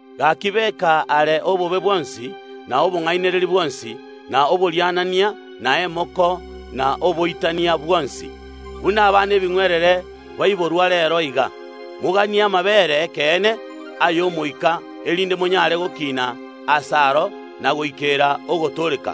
Gaki, beka are obobe bwonsi, na obong’ainereria bwonsi, na oborianania, na emoko, na oboitania bwonsi. Buna abana ebing’werere baiborwa reero iga, moganie amabeere ’ekeene ay’omoika, erinde monyare gokina ase aro, na goikera ogotooreka,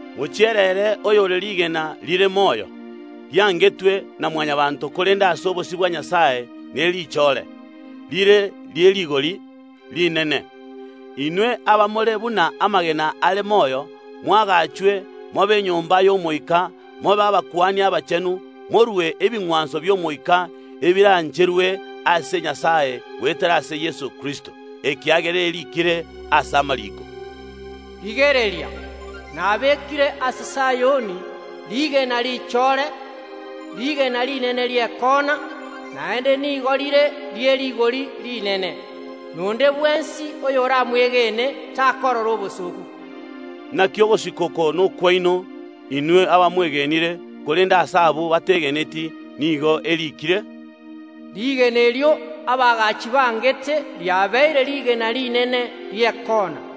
Mochiere ere, oyore rigena rire moyo, riangetwe na Mwanyabaanto, korende ase obosio bwa Nyasae nerichore, rire rie rigori rinene. Inwe abamore buna amagena are moyo moagachwe, mobe enyomba y’Omoika mobe abakuani abachenu, morue ebing’wanso bi’omoika ebirancherwe ase Nyasae goetera ase Yeso Kristo. Ekiagera eriikire ase amariiko, “Rigereria, nabekire ase Sayoni rigena richore, rigena rinene ri’ekoona, naende nigo rire rie rigori rinene, na onde bwensi oyoramwegene takorora obosooku.” Naki ogosika oko nokwaino, inwe abamwegenire. Korende ase abwo bategeneti nigo eriikire, “Rigena erio abaagachi bangete riabeire rigena rinene ri’ekoona,”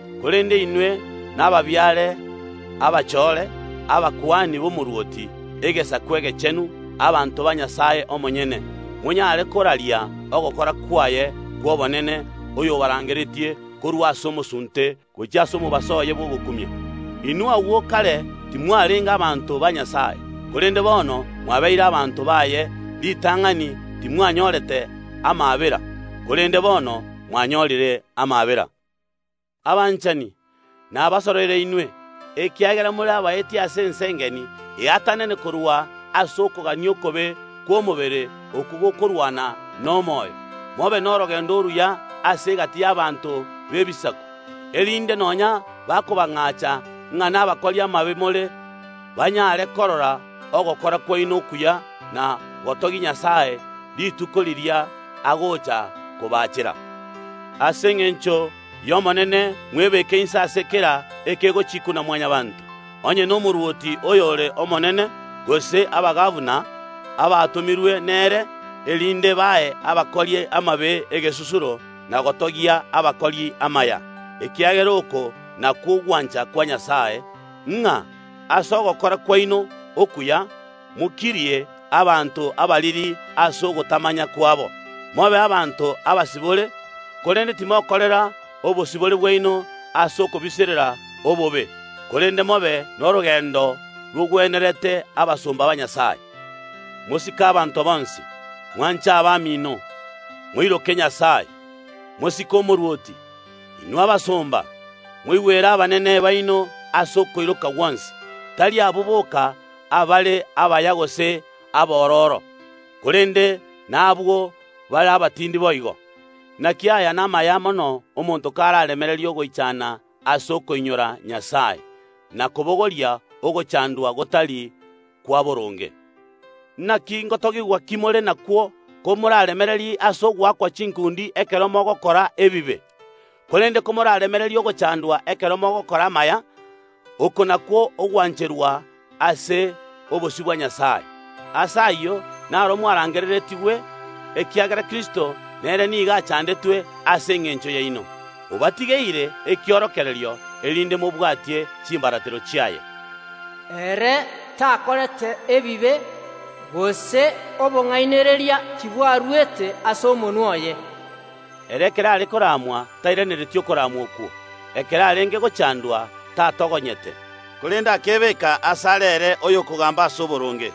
Korende inwe nababiare abachore, abakuani b’omorwoti, egesaku egechenu, abanto ba Nyasae omonyene, monyare koraria ogokora kwaye kw’obonene, oyobarangeretie korwa ase omosunte, gochia ase omobaso oye bw’ogokumia. Inwe agwo kare timwarenge abanto ba Nyasae, korende bono mwabeire abanto baye; ritang’ani timwanyorete amaabera, korende bono mwanyorire amaabera. Abanchani, nabasoroire inwe, ekiagera more abaeti ase ense engeni eatanane korwa ase okogania okobe kw’omobere okwo gokorwana nomoyo. Mobe norogendo oruya ase egati y’abanto b’Ebisaku, erinde nonya bakobang’acha ng’a nabakori amabe more, banyare korora ogokora kwaino okuya na gotogia Nyasae rituko riria agocha kobacheera. Ase engencho y’Omonene mwebeke inse ya kera ekegochikwa na Mwanyabaanto, onye nomorwoti oyore omonene, gose abagabana, abatomirwe nere, erinde bae abakori amabe egesusuro, na gotogia abakori amaya, ekiagera oko nakwo ogwancha kwa Nyasae, ng’a ase ogokora kwaino okuya mokirie abanto abariri ase ogotamanya kwabo. Mobe abanto abasibore, korende timokorera obosibore bwaino ase okobiserera obobe, korende mobe norogendo rogwenerete abasomba ba Nyasae. Mosike abanto bonsi. Mwanche abamino. Moiroke Nyasae. Mosike omorwoti. Inwe abasomba, moigwere abanene baino ase okoiroka gwonsi, tari abwo boka abare abaya gose abororo, korende na abwo bare abatindi boigo. Naki aya namaya mono omonto karaaremererie ogoichana ase okoinyora Nyasae, na kobogoria ogochandwa gotari kwa boronge. Naki ngotogigwa ki more nakwo komoraaremererie ase ogoakwa chinkundi ekero mogokora ebibe? Korende komoraaremererie ogochandwa ekero mogokora amaya, oko nakwo ogwancherwa ase obosio bwa Nyasae. Ase ayio naro mwarangereretigwe, ekiagera Kristo nere nigo achandetwe ase engencho yaino, obatigeire ekiorokererio, erinde mobwatie chimbaratero chiaye. Ere takorete ebibe, gose obong’ainereria tibwaruete ase omonwa oye. Ere ekero arenge koramwa tairaneretie okoramwa okwo, ekero arenge gochandwa tatogonyete, korende akebeka asare ere oyokogamba ase oboronge.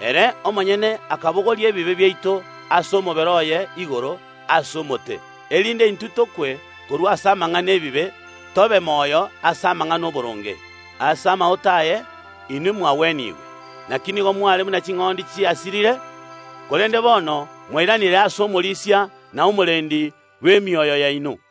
Ere omonyene akabogoria ebibe biaito ase omobere oye igoro ase omote, erinde intwe tokwe korwa ase amang’ana ’ebibe, tobe moyo ase amang’ana ’oboronge. Ase amaote aye inwe mwagwenigwe. Naki nigo mware buna ching’ondi chiasirire, korende bono mwairanire ase Omorisia na Omorendi bw’emioyo yaino.